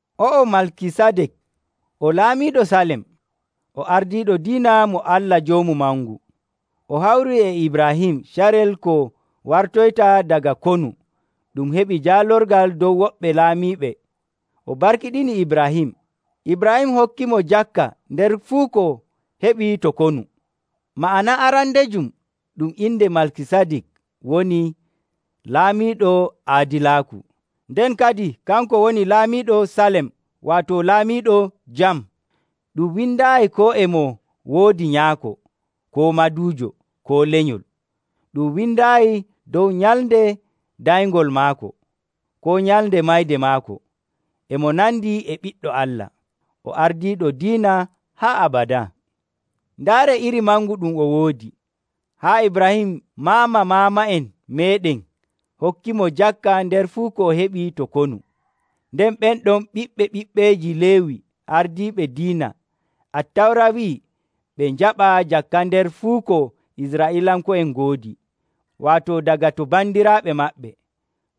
O'o Malkisadik, o laamiiɗo Salem, o ardiiɗo diina mo Allah Joomu Mangu. O hawrii e Ibraahim carel ko wartoyta daga konu ɗum heɓi jaalorgal dow woɓɓe laamiiɓe, o barkiɗini Ibraahim. Ibraahim hokkimo jakka nder fuu ko heɓi to konu. Ma'ana arandejum ɗum inde Malkisadik woni “Laamiiɗo Aadilaaku”; nden kadin kanko woni laamiiɗo Salem, waato “Laamiiɗo Jam.” Ɗum windaayi koo e mo woodi nyaako, koo maduujo, koo lenyol. Ɗum windaayi dow nyalnde danyngol maako, koo nyalnde mayde maako. E mo nandi e Ɓiɗɗo Allah, o ardiiɗo diina haa abadaa. Ndaaree iri mangu ɗum o woodi, haa Ibraahim maama maama'en meeɗen hokkiimo jakka nder fuu ko heɓi to konu. Nden ɓen ɗon ɓiɓɓe ɓiɓɓeeji Leewi ardiiɓe diina, Attawra wi'ii ɓe njaɓa jakka nder fuu ko Israa'iilanko'en ngoodi, waato daga to bandiraaɓe maɓɓe,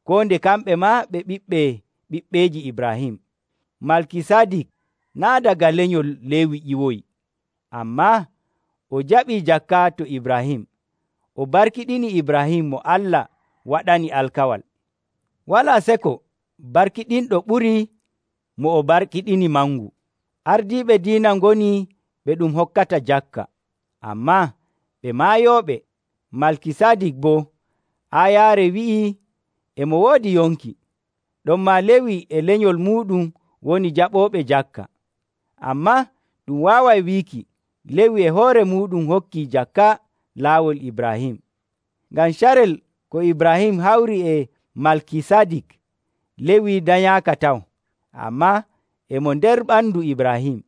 koo nde kamɓe maa ɓe ɓiɓɓe ɓiɓɓeeji Ibraahim. Malkisadik naa' daga lenyol Leewi ƴiwoyi, ammaa o jaɓii jakka to Ibraahim, o barkiɗini Ibraahim mo Allah waɗani alkawal. Walaa seko barkiɗinɗo ɓurii mo o barkiɗini mangu. Ardiiɓe diina ngoni ɓe ɗum hokkata jakka, ammaa ɓe maayooɓe. Malkisadik boo, aayaare wi'ii e mo woodi yonki. Ɗonmaa Leewi e lenyol muuɗum woni jaɓooɓe jakka. Ammaa ɗum waaway wiiki, Leewi e hoore muuɗum hokkii jakka laawol Ibraahim. Ngam carel ko Ibraahim hawri e Malkisadik, Leewi danyaaka taw, ammaa e mo nder ɓandu Ibraahim.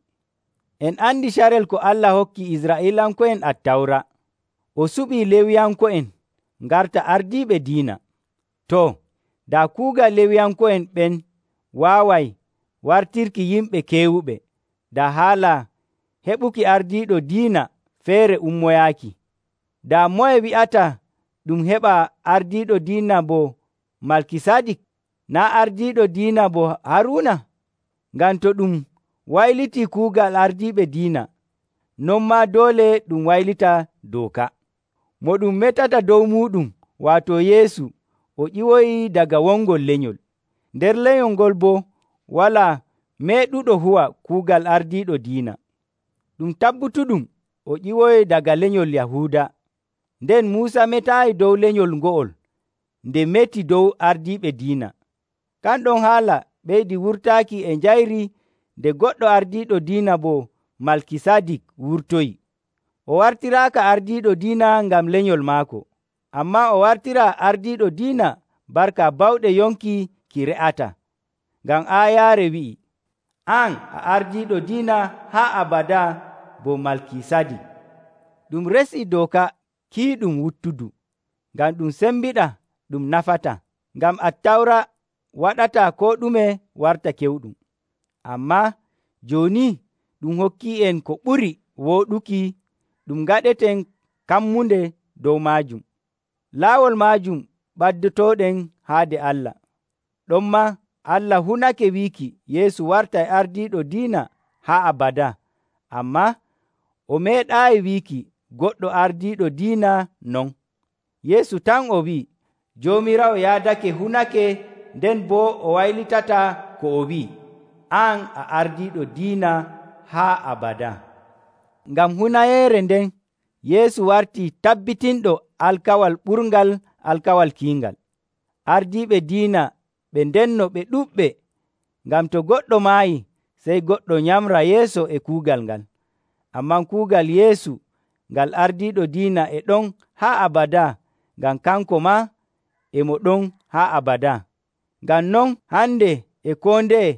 En andi carel ko Allah hokki Israa'iilanko'en Attawra, o suɓii Leewiyanko'en ngarta ardiiɓe diina. Too, daa kuugal Leewiyanko'en ɓen waaway wartirki yimɓe keewuɓe, daa haala heɓuki ardiiɗo diina feere ummoyaaki. Daa moye wi'ata ɗum heɓa ardiiɗo diina bo Malkisadik, naa' ardiiɗo diina bo Haruuna? Ngam to ɗum waylitii kuugal ardiiɓe diina, non maa doole ɗum waylita dooka. Mo ɗum metata dow muuɗum, waato Yeesu, o ƴiwoyii daga wongol lenyol. Nder lenyol ngol boo walaa meeɗuɗo huwa kuugal ardiiɗo diina. Ɗum tabbutuɗum o ƴiwoyii daga lenyol Yahuuda, nden Muusa metaayi dow lenyol ngo'ol nde meti dow ardiiɓe diina. Kan ɗon haala ɓeydii wurtaaki e njayri nde goɗɗo ardiiɗo diina bo Malkisadik wurtoyii. O wartiraaka ardiiɗo diina ngam lenyol maako, ammaa o wartiraa ardiiɗo diina barka bawɗe yonki ki re'ataa. Ngam aayaare wi'ii, “An a ardiiɗo diina haa abadaa bo Malkisadik.” Ɗum resii dooka kiiɗum wuttudu, ngam ɗum sembiɗaa ɗum nafataa. Ngam Attawra waɗataa koo ɗume warta kewɗum. Ammaa jooni ɗum hokkii'en ko ɓuri wooɗuki ɗum ngaɗeten kammunde dow maajum. Laawol maajum ɓaddotooɗen haade Allah. Ɗonmaa Allah hunake wiiki Yeesu wartay ardiiɗo diina haa abadaa, ammaa o meeɗaayi wiiki goɗɗo ardiiɗo diina non. Yeesu tan o wi'i, “Joomiraawo yaadake hunake nden boo o waylitataa ko o wi'i, ‘An a ardiiɗo diina haa abadaa.’” Ngam hunayeere nden, Yeesu wartii tabbitinɗo alkawal ɓurngal alkawal kiingal. Ardiiɓe diina ɓe ndenno ɓe ɗuɗɓe, ngam to goɗɗo maayi, sey goɗɗo nyamra yeeso e kuugal ngal. Ammaa kuugal Yeesu ngal ardiiɗo diina e ɗon haa abadaa ngam kanko maa e mo ɗon haa abadaa. Ngam non, hande e koo ndeye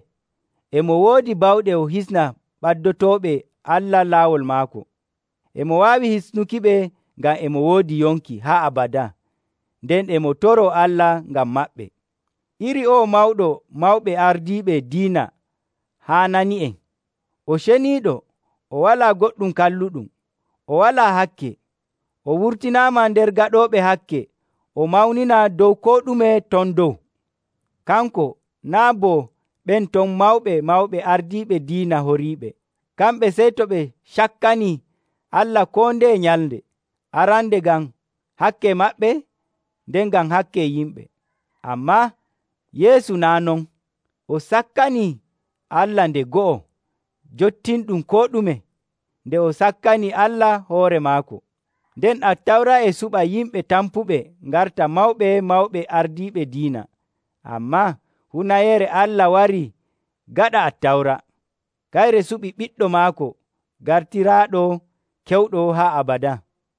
e mo woodi bawɗe o hisna ɓaddotooɓe Allah laawol maako. E mo waawi hisnukiɓe ngam e mo woodi yonki haa abadaa, nden e mo toroo Allah ngam maɓɓe. Iri o'o Mawɗo Mawɓe Ardiiɓe Diina haanani'en. O ceniiɗo, o walaa goɗɗum kalluɗum, o walaa hakke, o wurtinaama nder gaɗooɓe hakke o mawninaa dow koo ɗume ton dow. Kanko naa' bo ɓen ton mawɓe mawɓe ardiiɓe diina horiiɓe. Kamɓe sey to ɓe cakkanii Allah koo ndeye nyalnde, arande ngam hakke maɓɓe, nden ngam hakke yimɓe. Ammaa Yeesu naa' non. O sakkanii Allah nde go'o, jottinɗum koo ɗume, nde o sakkani Allah hoore maako. Nden Attawra e suɓa yimɓe tampuɓe ngarta mawɓe mawɓe ardiiɓe diina. Ammaa hunayeere Allah warii gaɗa Attawra. Kayre suɓi Ɓiɗɗo maako gartiraaɗo kewɗo haa abadaa.